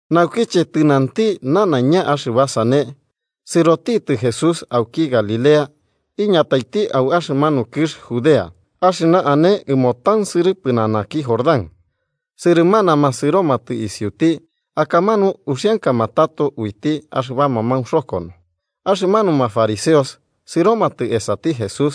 Naukiche tɨnanti nanaiña axɨba sane, sɨrotitɨ Jesús auki Galilea iñataiti au axɨmanu kɨx Judea axɨna ane ɨmo tansɨrɨ pɨnanaki Jordán. Sɨrɨmanama sɨromatɨ isiuti, akamanu uxiankama tato uiti axɨbama maunxokono. Axɨmanuma fariseos sɨromatɨ esati Jesús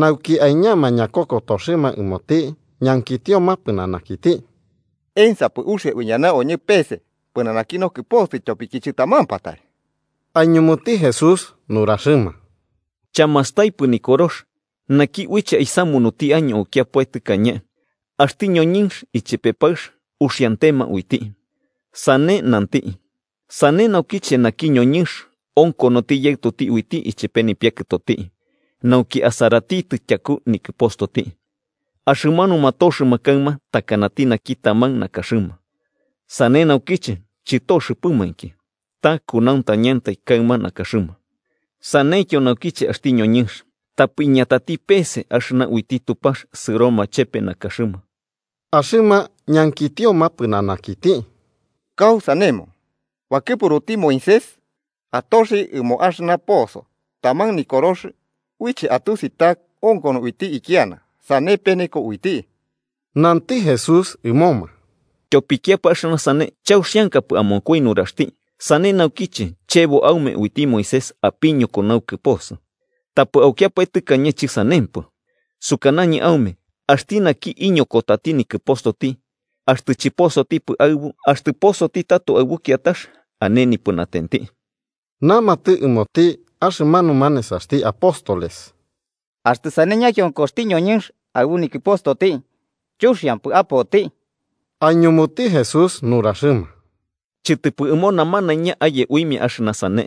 nauki aiñama ñakokotoxɨma ɨmoti, ñankitioma pɨnanakiti: –¿Ensapɨ uxia uiñana oñɨ peese pɨnanaki nokɨposɨ ityopiki chɨtamampatai? Aiñumuti Jesús nuraxɨma: –¿Chamastaipɨ Nikorox naki uiche aisamunuti año aukiapae tɨkañe, ‘axti ñoñɨnx ichepe paɨx uxiantema uiti’? Sane nanti: ‘Sane naukiche naki ñoñɨnx onkonoti yaɨtoti uiti ichepe nipiakɨtoti nauki asaratitɨ tyaku nikɨpostoti, axɨmanuma toxɨma kaɨma takanati naki taman nakaxɨma.’ Sane naukiche chɨtoxɨpɨmainki, ta kunauntañati kaɨma nakaxɨma. Saneityo naukiche axti ñoñɨnx tapɨ iñatati peese axɨna uiti Tupax sɨroma chepe nakaxɨma. Axɨma ñankitioma pɨnanakiti: –¿Kausanemo, bakɨpuruti Moisés atoxi ɨmo axɨna poso taman nikorox uiche atusi ta onkono uiti ikiana, sane peneko uiti? Nanti Jesús ɨmoma: –Tyopikiapae axɨna sane chauxiankapɨ amonkoi nuraxti, sane naukiche chebo aume uiti Moisés apiñoko naukɨposɨ. Tapɨ aukiapae tɨkañe chɨsanempɨ. Sukanañɨ aume axti naki iñokotati nikɨpostoti, axtɨ chɨposotipɨ aɨbu, axtɨ posoti tato aɨbu kiatax, ane nipɨnatenti. Namatɨ ɨmoti axɨmanuma nesaxti apóstoles: –Axtɨ sane ñakionkoxti ñoñɨnx aɨbu nikɨpostoti, chuxiampɨ apoti. Aiñumuti Jesús nuraxɨma: –Chɨtɨpɨ ɨmo namanaiña aye uimia axɨna sane,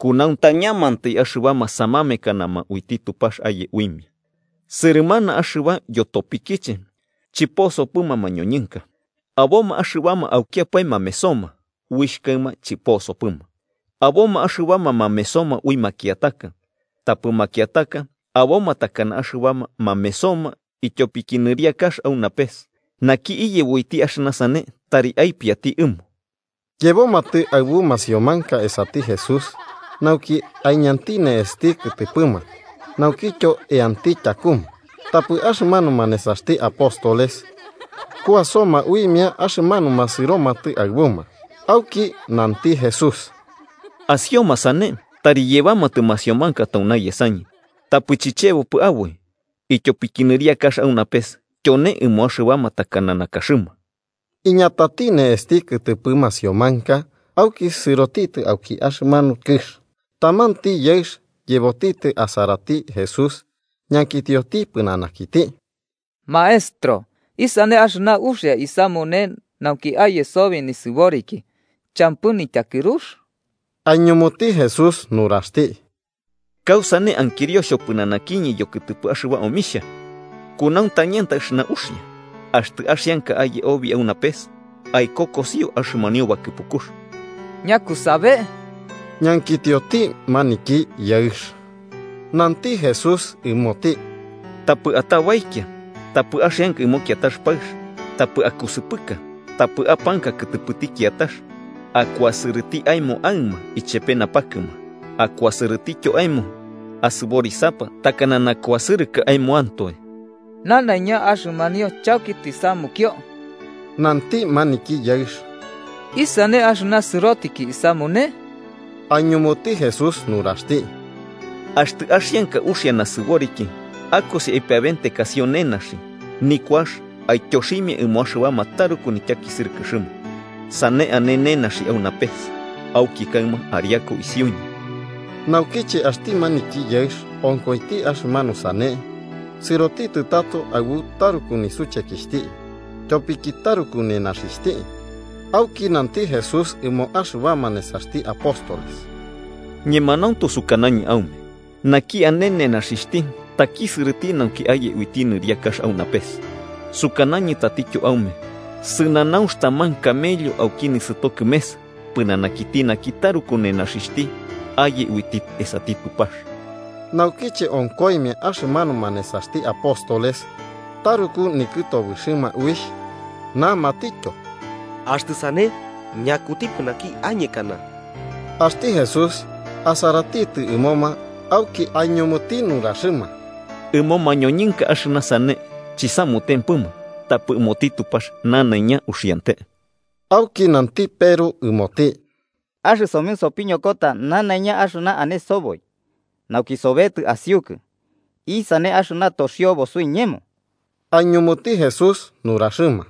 kunauntañamantai axɨbama samamekanama uiti Tupax aye uimia. Sɨrɨmana axɨba yotopikiche chɨposopɨma mañoñɨnka: aboma axɨbama aukiapae mamesoma uixh kaɨma chɨposopɨma, aboma axɨbama mamesoma ui makiataka, tapɨ makiataka aboma takana axɨbama mamesoma ityopiki nɨriakax au napes. Naki iyebo uiti axɨna sane, tari aipiati ɨmo. Yebomatɨ aɨbu masiomanka esati Jesús, nauki aiñanti ne'esti kɨtɨpɨma naukityo eanti tyakuma. Tapɨ axɨmanuma nesaxti apóstoles kuasoma uimia axɨmanuma sɨromatɨ aɨbuma. Auki nanti Jesús: –Asioma sane tari yebamatɨ masiomanka tauna yesañɨ, tapɨ chichebopɨ aboi, ityopiki nɨriakax au napes tyone ɨmo axɨbama takana nakaxɨma. Iñatati ne'esti kɨtɨpɨ masiomanka, auki sɨrotitɨ auki axɨmanu kɨx. Tamanti yaɨx yebotitɨ asarati Jesús, ñankitioti pɨnanakiti: –Maestro, ¿isane axɨna uxia isamune nauki aye sobi nisɨboriki champɨ nityakɨrux? Aiñumuti Jesús nuraxti: –¿Kausane ankirio xhopɨnanakiñɨ yokɨtɨpɨ axɨba omixhia? Kunauntañantai axɨna uxia. Axtɨ axianka aye obi au napes, aikokosio axɨmanio bakɨpukux. 18–¿Ñakusabe?–ñankitioti maniki yaɨx. Nanti Jesús ɨmoti: –‘Tapɨ atabaikia, tapɨ axianka ɨmo kiatax paɨx, tapɨ akusɨpɨka, tapɨ apanka kɨtɨpɨti kiatax, akuasɨrɨti aemo aɨma ichepe napakɨma, akuasɨrɨtityo aemo asɨborisapa takana nakuasɨrɨkɨ aemoantoe.’ 20–Nanaiña axɨmanio chauki tisamukio–nanti maniki yaɨx–. ¿Isane axɨna sɨrotiki isamune? Aiñumuti Jesús nuraxti: –Axtɨ axianka uxia nasɨboriki, akosi, aipiabentekasio nenaxi nikuax aityoximia ɨmo axɨbama taruku nityakisɨrɨkɨxɨma. Sane ane nenaxi au napes. Auki kaɨma ariaku isiuñɨ. Naukiche axti maniki yaɨx onkoiti axɨmanu sane, sɨrotitɨ tato aɨbu taruku nisuchekixhti, tyopiki taruku nenaxixhti. Auki nanti Jesús ɨmo axɨbama nesaxti apóstoles: –Ñemanauntu sukanañɨ aume naki ane nenaxixhti takisɨrɨti nauki aye uiti nɨriakax au napes. Sukanañɨ tatityo aume sɨnanaunx taman camello auki nisɨto kɨmes, pɨnanakiti naki taruku nenaxixhti aye uiti esati Tupax. Naukiche onkoimia, axɨmanuma nesaxti apóstoles taruku nikɨtobɨxɨma uixh, namatityo: –Axtɨ sane, ¿ñakutipɨ naki añekana? Axti Jesús asaratitɨ ɨmoma auki aiñumuti nuraxɨma: –Ɨmo mañoñɨnka axɨna sane chisamutempɨma, tapɨ ɨmoti Tupax nanaiña uxiante. Auki nanti Peru ɨmoti: –Axɨsomɨ sopiñokota nanaiña axɨna ane soboi, nauki sobetɨ asiukɨ. ¿Isane axɨna toxiobo suiñemo? Aiñumuti Jesús nuraxɨma: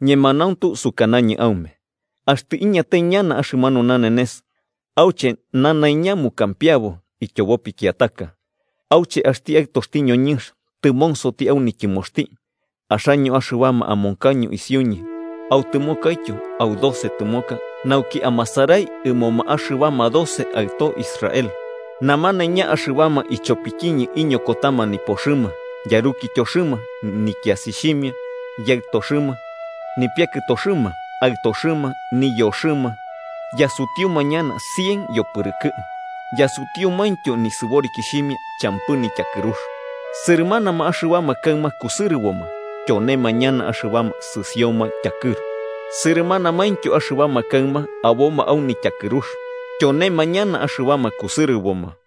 –Ñemanauntu sukanañɨ aume axtɨ iñatai ñana axɨmanu nanenes auche nanaiña mukampiabo ityobo pikiataka, auche axti Aɨtoxti ñoñɨnx tɨmonsoti au nityɨmoxti, axaño axɨbama amonkaño isiuñɨ autɨmokaityo au doce tɨmoka nauki amasarai ɨmoma axɨbama doce aɨtoxti Israel. Namanaiña axɨbama ichopikiñɨ iñokotama nipoxɨma, yarukityoxɨma, nikiasixhimia, yaɨtoxɨma, nipiakɨtoxɨma, aɨtoxɨma, niyoxɨma, yasutiuma ñana cien yopɨrɨkɨ, yasutiumaintyo nisɨborikixhimia champɨ nityakɨrux. Sɨrɨmanama axɨbama kaɨma kusɨrɨboma, tyonema ñana axɨbama sɨsioma tyakɨru. Sɨrɨmanamaintyo axɨbama kaɨma aboma au nityakɨrux, tyonema ñana axɨbama kusɨrɨboma.